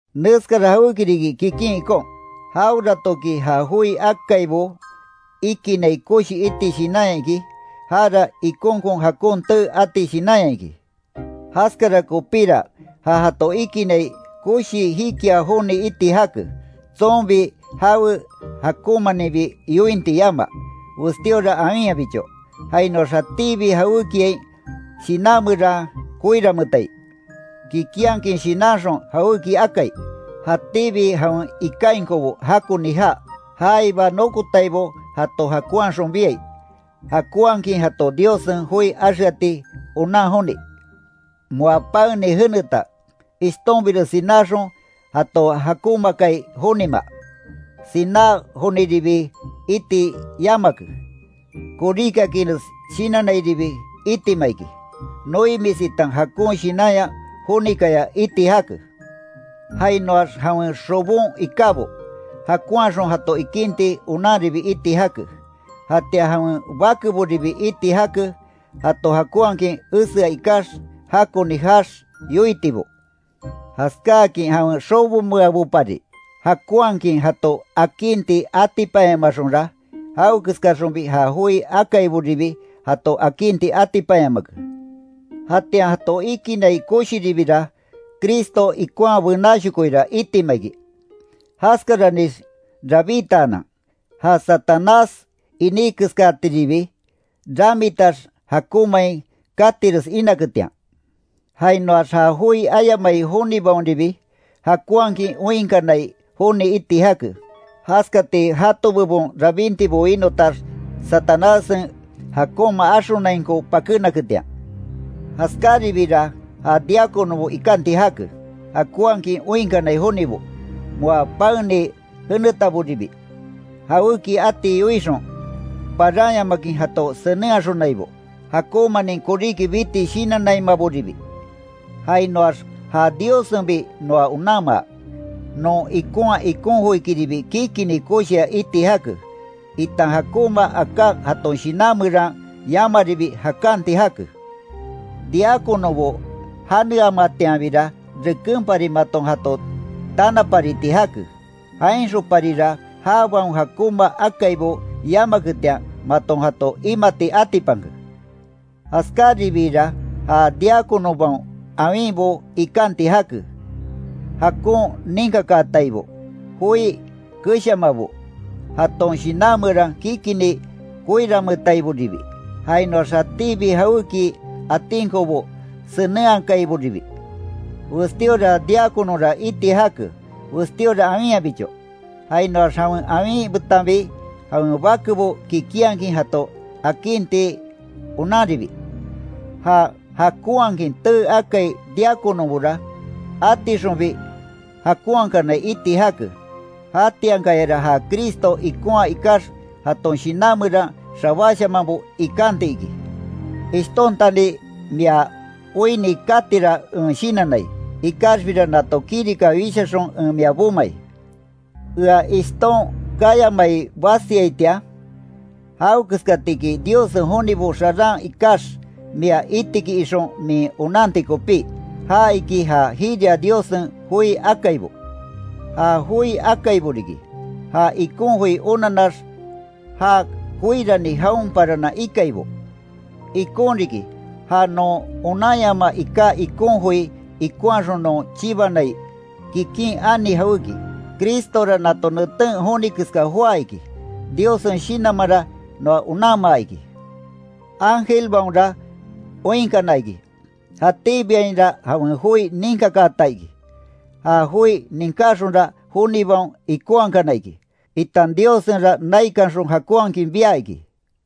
Neskara jawéki riki kikin ikon, jaweratoki ja joi akaibo ikinai koshi iti shinanya iki, jara ikonkon jakon tee ati shinanya iki. Jaskara kopíra ja jato ikinai koshi jikia joni iti jake, tsonbi jawe jakonmaninbi yointi yamaa, westíora awinyabicho, jainoax jatíbi jawékiain shinan meran koiranmeetai, kikinhakin shinanxon jawéki akai, jatíbi jawen ikainkobo jakoni jaa, jaiba nokotaibo jato jakonhaxon biai, jakonhakin jato Diossen joi axeati onan joni, moa paeni jeneta, ishtonbires sináxon jato jakonmaakai jonima, siná joniribi iti yamake, koríkiakinres shinannairibi itima iki, noimis itan jakon shinanya jonikaya iti jake. Jainoax jawen xobon ikábo, jakonhaxon jato ikinti onanribi iti jake, jatian jawen bakeboribi iti jake, jato jakonhakin esea ikax, jakoni jaax yoitibo, jaskáakin jawen xobomeabopari jakonhakin jato akinti atipanyamaxonra, jawekeskaxonbi ja joi akaiboribi jato akinti atipanyamake. Jatian jato ikinai koshiribira, Cristo ikonhaa benáshokoira itima iki, jaskaranix rabítaanan, ja Satanás iní keskatiribi ramitax jakonmain katires inaketian. Jainoax ja joi ayamai jonibaonribi, jakonhakin oinkanai joni iti jake, jaskati jato bebon rabintibo winotax, Satanássen jakonma axonainko pakénaketian. Jaskaribiira ja diáconobo ikanti jake, jakonhakin oinkanai jonibo, moa paeni jenetaboribi, jawéki ati yoixon, paranyamakin jato senenhaxonaibo, jakonmanin koríki biti shinannaimaboribi, jainoax ja Diossenbi noa onanmaa, non ikonhaa ikon joikiribi kikini koshia iti jake, itan jakonma aká jaton shinan meran yamaribi jakanti jake. Diáconobo janeamatianbira rekenpari maton jato tanapariti jake, jainxonparira jabaon jakonma akaibo yamaketian maton jato imati atipanke. Jaskáribiira ja diáconobaon awinbo ikanti jake, jakon ninkakaataibo, joi keshamabo, jaton shinan meran kikini koiranmeetaiboribi, jainoax jatíbi jawéki atinkobo senenhakaiboribi. Westíora diáconora iti jake, westíora awinyabicho, jainoax jawen awin betanbi jawen bakebo kikinhakin jato akinti onanribi. Ja jakonhakin tee akai diáconobora, atixonbi jakonhakanai iti jake. Jatiankayara ja Cristo ikonhaa ikax jaton shinan meran xabáshamanbo ikanti iki. Ishtontani mia oinni katira en shinannai, ikaxbira nato kirika wishaxon en mia bomai, Ea ishton kayamai basiaitian, jawekeskatiki Diossen jonibo xaran ikax mia iti iki ixon min onanti kopí, ja iki ja jiria Diossen joi akaibo. Ja joi akaibo riki, ja ikon joi onanax ja koirani jaon paranan ikaibo. Ikon riki ja non onanyamaa iká ikon joi ikonhaxon non chibanai, kikin ani jawéki. Cristora nato neten joni keska joá iki. Diossen Shinanmanra noa onanmaa iki. Ángelbaonra oinkana iki. Jatíbiainra jawen joi ninkakaata iki. Ja joi ninkáxonra jonibaon ikonhakana iki, itan Diossenra naikanxon jakonhakin bia iki.